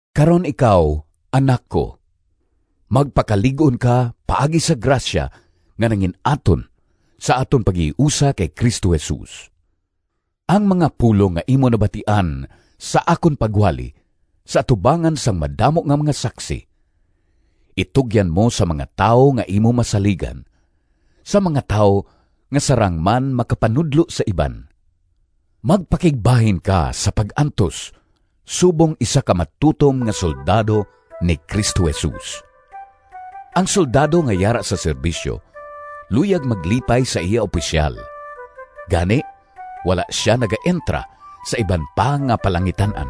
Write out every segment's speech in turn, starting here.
Karon ikaw, anak ko, magpakalig-on ka paagi sa grasya nga nangin-aton sa aton paghiusa kay Cristo Jesus. Ang mga pulong nga imo nabatian sa akon pagwali sa atubangan sang madamo nga mga saksi itugyan mo sa mga tawo nga imo masaligan, sa mga tawo nga sarang man makapanudlo sa iban. Magpakigbahin ka sa pag-antos subong isa ka matutom nga soldado ni Cristo Jesus. Ang soldado nga yara sa serbisyo luyag maglipay sa iya opisyal. Gani wala sia nagaentra sa iba pa nga palangitan-an.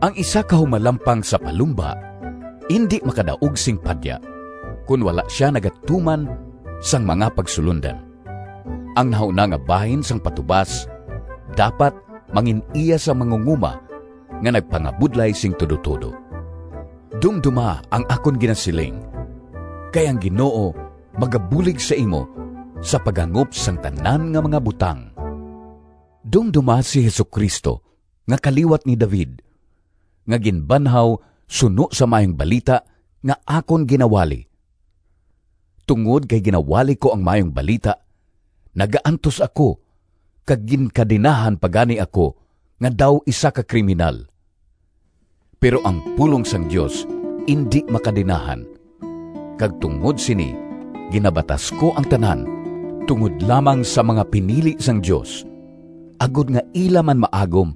Ang isa ka humalampang sa palumba indi makadaog sing padya, kon wala sia nagatuman sang mga pagsulondan. Ang nahauna nga bahin sang patubas dapat mangin-iya sang mangungoma nga nagpangabudlay sing tudotudo. Dumdoma ang akon ginasiling, kay ang Ginoo magabulig sa imo sa paghangop sang tanan nga mga butang. Dumdoma si Jesu-Cristo nga kaliwat ni David, nga ginbanhaw suno sa Maayong Balita nga akon ginawali. Tungod kay ginawali ko ang Maayong Balita, nagaantos ako kag ginkadenahan pa gani ako nga daw isa ka kriminal. Pero ang pulong sang Dios indi makadenahan, kag tungod sini ginabatas ko ang tanan tungod lamang sa mga pinili sang Dios, agod nga ila man maagom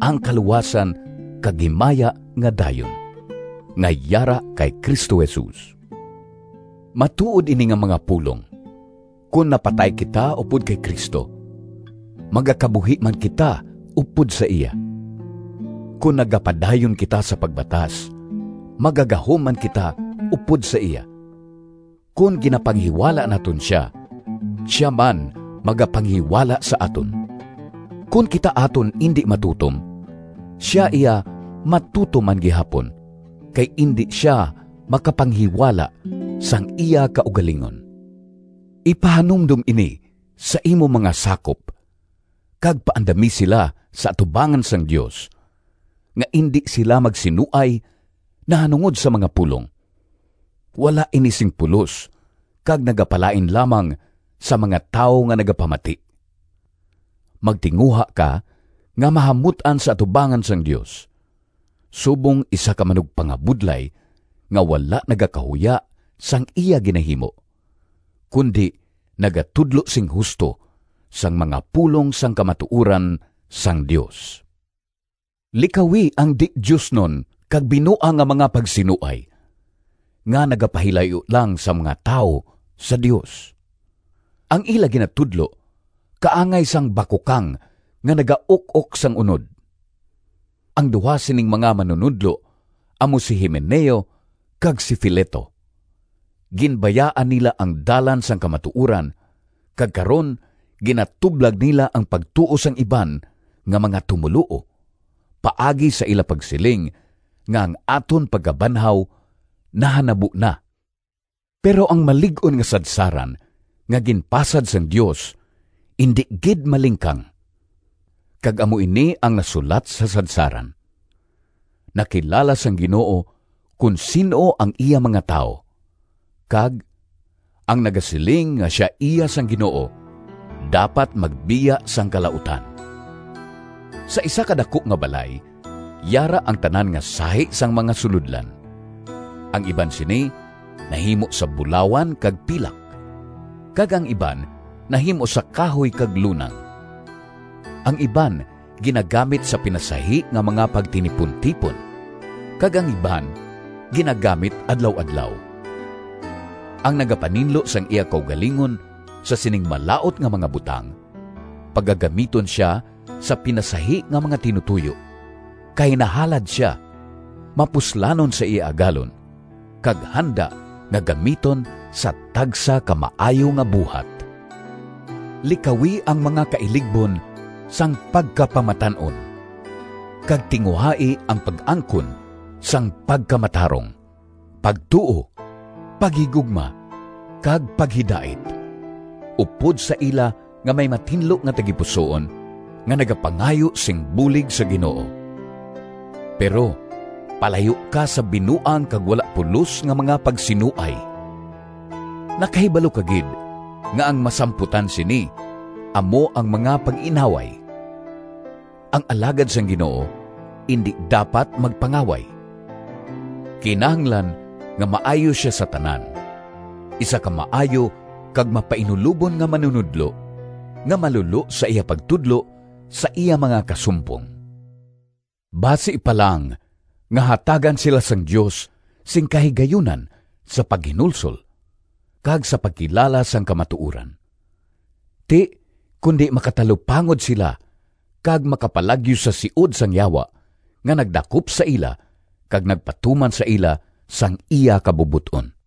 ang kaluwasan kag himaya nga dayon, nga yara kay Cristo Jesus. Matuod ini nga mga pulong: “Kon napatay kita upod kay Cristo, Magakabuhi man kita upod sa iya. Kon nagapadayon kita sa pagbatas, Magagahom man kita upod sa iya. Kon ginapanghiwala naton sia, Sia man magapanghiwala sa aton. Kon kita aton indi matutom, Sia iya matutom man gihapon, Kay indi sia makapanghiwala Sang iya kaugalingon.” Ipahanumdom ini sa imo mga sakop kag paandami sila sa atubangan sang Dios, nga indi sila magsinuay nahanungod sa mga pulong. Wala ini sing pulos kag nagapalain lamang sang mga tawo nga nagapamati. Magtinguha ka nga mahamut-an sa atubangan sang Dios, subong isa ka manugpangabudlay nga wala nagakahuya sang iya ginahimo, kundi nagatudlo sing husto sang mga pulong sang kamatuoran sang Dios. Likawi ang di-diosnon kag binuang nga mga pagsinuay nga nagapahilayo lang sang mga tawo sa Dios. Ang ila ginatudlo kaangay sang bakukang nga nagauk-ok sang unod. Ang duha sining mga manunodlo amo si Himeneo kag si Fileto. Ginbayaan nila ang dalan sang kamatuoran kag karon ginatublag nila ang pagtuo sang iban nga mga tumoluo paagi sa ila pagsiling nga ang aton pagkabanhaw nahanabo na. Pero ang malig-on nga sadsaran nga ginpasad sang Dios indi gid malingkang, kag amo ini ang nasulat sa sadsaran: “Nakilala sang Ginoo kon sin-o ang iya mga tawo,” kag “Ang nagasiling nga sia iya sang Ginoo dapat magbiya sang kalautan.” Sa isa ka daku nga balay yara ang tanan nga sahi sang mga sulodlan. Ang iban sini nahimo sa bulawan kag pilak, kag ang iban nahimo sa kahoy kag lunang. Ang iban ginagamit sa pinasahi nga mga pagtinipuntipon kag ang iban ginagamit adlaw-adlaw. Ang nagapaninlo sang iya kaugalingon sa sining malaut nga mga butang, pagagamiton sia sa pinasahi nga mga tinutoyo, kay nahalad sia, mapuslanon sa iya Agalon, kag handa nga gamiton sa tagsa ka maayo nga buhat. Likawi ang mga kailigbon sang pagkapamatan-on, kag tinguhai ang pag-angkon sang pagkamatarong, pagtuo, paghigugma kag paghidait, upod sa ila nga may matinlo nga tagipusoon nga nagapangayo sing bulig sa Ginoo. Pero, palayo ka sa binuang kag wala pulos nga mga pagsinuay. Nakahibalo ka gid nga ang masamputan sini amo ang mga pag-inaway. Ang alagad sang Ginoo indi dapat magpangaway. Kinahanglan nga maayo sia sa tanan, isa ka maayo kag mapainulobon nga manunodlo, nga malulo sa iya pagtudlo sa iya mga kasumpong. Basi pa lang nga hatagan sila sang Dios sing kahigayunan sa paghinulsol kag sa pagkilala sang kamatuoran. Ti kundi makatalupangod sila kag makapalagyo sa siod sang Yawa nga nagdakop sa ila kag nagpatuman sa ila sang iya kabubot-on.